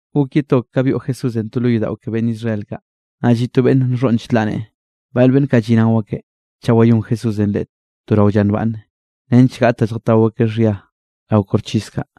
Gok ye to ka byoꞌ Jesúsenꞌ to lo yodaꞌo ke beꞌnn Israel kaꞌ, naꞌ lliꞌ to beꞌnn nxhoꞌn chlaꞌ neꞌe. Bal beꞌnn kaꞌ lliꞌnao akeꞌ chaꞌ wayón Jesúsenꞌ leꞌe to rao lla nbaꞌnne, nench gaꞌt da lljatao akeꞌ xhia rao koxchis kaꞌ.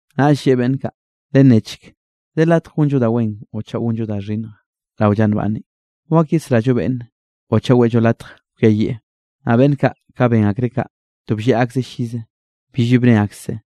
Naꞌll lleꞌe beꞌnn kaꞌ: —Lennechk, ¿de latj gonllo da wen o chaꞌ gonllo da xhinnj rao lla nbaꞌnne? ¿Wak yesrallo beꞌnne o chaꞌ weꞌllo latj kwiayieꞌ? Naꞌ beꞌnn kaꞌ ka ben akreꞌ kaꞌ, to blleꞌ akzeꞌ llize, billbi bne akseꞌ.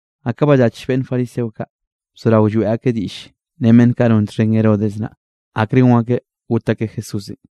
Naꞌ ka ballach beꞌnn fariseo kaꞌ, bzorao lloeꞌ akeꞌ diꞌll ren beꞌnn kaꞌ non txhen Herodes naꞌ, akre gon akeꞌ got akeꞌ Jesúsenꞌ.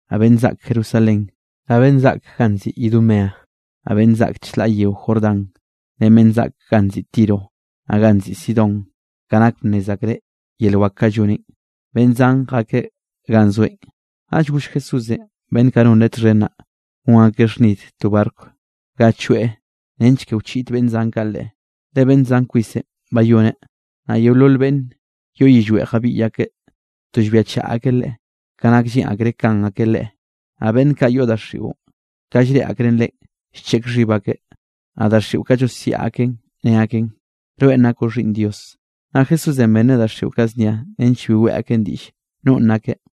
Naꞌ beꞌnn zaꞌk Jerusalén, naꞌ beꞌnn zaꞌk ganꞌ nziꞌi Idumea, naꞌ beꞌnn zaꞌk chlaꞌ yeo Jordán, ren beꞌnn zaꞌk ganꞌ nziꞌi Tiro, naꞌ ganꞌ nziꞌi Sidón, ka nak bnnez akreꞌ yel wak kaꞌ lloneꞌn, beꞌnn zan jakeꞌ ganꞌ zoeꞌn. Naꞌll goll Jesúsenꞌ beꞌnn kaꞌ non Leꞌe txhen naꞌ, gon akeꞌ xhnid to barco ga choeꞌ nench ke wchiꞌd beꞌnn zan kaꞌ Leꞌe, le beꞌnn zan kwisenꞌ bayoneꞌ, naꞌ yeolol beꞌnn yoꞌ yillweꞌ jabiꞌy akeꞌ to llbiachaꞌ akeꞌ Leꞌe, ka nak lleꞌn akreꞌ kan akeꞌ Leꞌe. Naꞌ beꞌnn kaꞌ yoꞌ daxiꞌon, ka llreꞌe akreꞌ Leꞌen, llcheꞌk xhib akeꞌ naꞌ daxiꞌo kaꞌ llosiaꞌ aken ne aken: —Rweꞌn nakoꞌ Xhiꞌnn Dios. Naꞌ Jesúsenꞌ benreꞌ daxiꞌo kaꞌ znia nench bi weꞌe aken diꞌll nonꞌ nakeꞌ.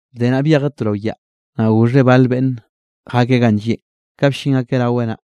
Bde naꞌ, byejeꞌ to rao yaꞌ, naꞌ goxheꞌ bal beꞌnn jakeꞌ ganꞌ llieꞌn. Ka bllin akeꞌ raweꞌ naꞌ,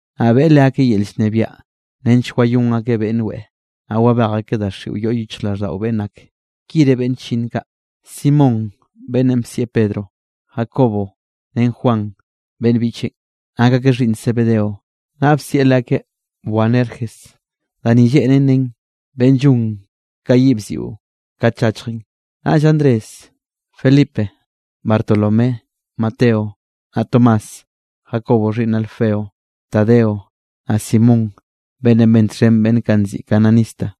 Naꞌ beꞌe leakeꞌ yel llnebiaꞌ nench wayón akeꞌ beꞌnn weꞌe, naꞌ wabej akeꞌ daxiꞌo yoꞌ yichjraꞌlldaꞌo beꞌnn ak. Ki re beꞌnn chllinn kaꞌ: Simón beꞌnnenꞌ bsieꞌ Pedro. Jacobo ren Juan beꞌnn biꞌcheꞌn, nak akeꞌ xhiꞌnn Zebedeo, naꞌ bsieꞌ leakeꞌ Boanerges, da ni lleꞌnen nen beꞌnn llon ka yiꞌ bziꞌo kat llachjen; naꞌll Andrés, Felipe, Bartolomé, Mateo naꞌ Tomás, Jacobo xhiꞌnn Alfeo, Tadeo, naꞌ Simón, beꞌnnenꞌ ben txhen beꞌnn kaꞌ nziꞌi cananista,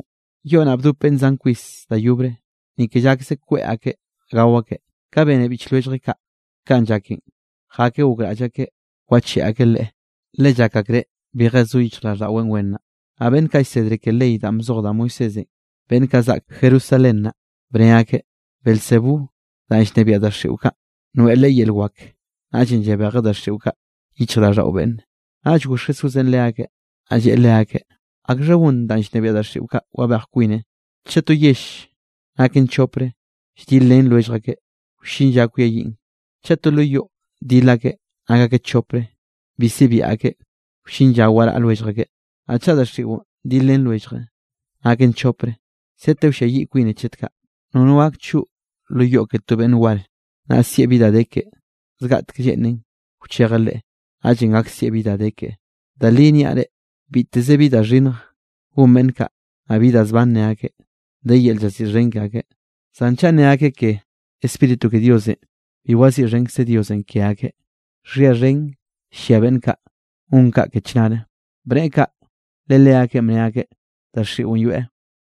Yoꞌ naꞌ bdop beꞌnn zan kwis da yobre, ni ke llakze kweꞌ akeꞌ gao akeꞌ. Ka bene biꞌch lwelljeꞌ kaꞌ kanꞌ llaken, jakeꞌ gokraꞌll akeꞌ wacheꞌe akeꞌ Leꞌe, le llak akreꞌ bije zo yichjraꞌlldaꞌweꞌ wen naꞌ. Naꞌ beꞌnn kaꞌ llsedre ke ley danꞌ bzoj da Moisésenꞌ, beꞌnn kaꞌ zaꞌk Jerusalén naꞌ, bne akeꞌ: —Beelzebú danꞌ llnebiaꞌ daxiꞌo kaꞌ, noeꞌn Leꞌe yel wak, naꞌllenꞌ llabejeꞌ daxiꞌo kaꞌ yichjraꞌlldaꞌo beꞌnne. Naꞌll goxh Jesúsenꞌ leakeꞌ, naꞌ lleꞌe leakeꞌ: —¿Akxha gon danꞌ llnebiaꞌ daxiꞌo kaꞌ wabej kwine? Chaꞌ to yell naken chopre, lldilrén lwellj akeꞌ, wllin lla kwiayiꞌn. Chaꞌ to lo yoꞌ dil akeꞌ nak akeꞌ chopre bi sibia akeꞌ, wllin lla waraꞌ lwellj akeꞌ. Naꞌ chaꞌ daxiꞌon dil ren lwellje naken chopre, sete wlliayiꞌ kwine chet kaꞌ. ’Nono gak choꞌ lo yoꞌ ke to beꞌnn war, naꞌ sieꞌ bi da de keꞌe. Zgaꞌtek lleꞌnen wchejeꞌ leꞌe, naꞌllenꞌ gak sieꞌ bi da de keꞌe. ’Da li niaꞌ reꞌ, biteze bi da xhinnj gon beꞌnn kaꞌ, naꞌ bi da zban ne akeꞌ, de yel llaziꞌxhen ke akeꞌ. Zan chaꞌ nne akeꞌ ke Spíritu ke Diosenꞌ, bi waziꞌxhenkze Diosenꞌ ke akeꞌ, xhia xhen llia beꞌnn kaꞌ gon kaꞌ ke chnare. Bneꞌe kaꞌ le leakeꞌn bne akeꞌ, daxiꞌon yoeꞌ.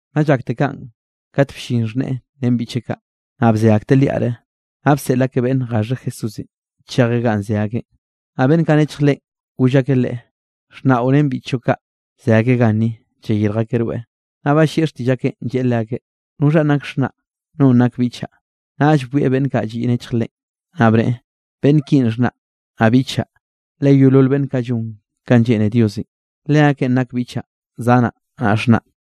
Naꞌ llakte kaꞌn, kat bllin xhneꞌe ren biꞌcheꞌ kaꞌ, naꞌ bze akteꞌ liaꞌte, naꞌ bseꞌl akeꞌ beꞌnne gaxheꞌ Jesúsenꞌ chejeꞌ ganꞌ ze akeꞌn. Naꞌ beꞌnn kaꞌ nechj Leꞌen, goll akeꞌ Leꞌe: —Xhnaꞌo ren biꞌchoꞌ kaꞌ ze akeꞌ ganni, llayirj akeꞌ rweꞌ. Naꞌ ballieꞌ xtiꞌll akeꞌn, lleꞌe leakeꞌ: —¿Noxhanꞌ nak xhnaꞌ? ¿Nonꞌ nak biꞌchaꞌ? Naꞌll bwieꞌ beꞌnn kaꞌ lliꞌ nechj Leꞌen, naꞌ bneꞌe: —Beꞌnn kinꞌ xhnaꞌ, naꞌ biꞌchaꞌ. Le yeolol beꞌnn kaꞌ llon kanꞌ lleꞌne Diosenꞌ, leakeꞌn nak biꞌchaꞌ, zanaꞌ naꞌ xhnaꞌ.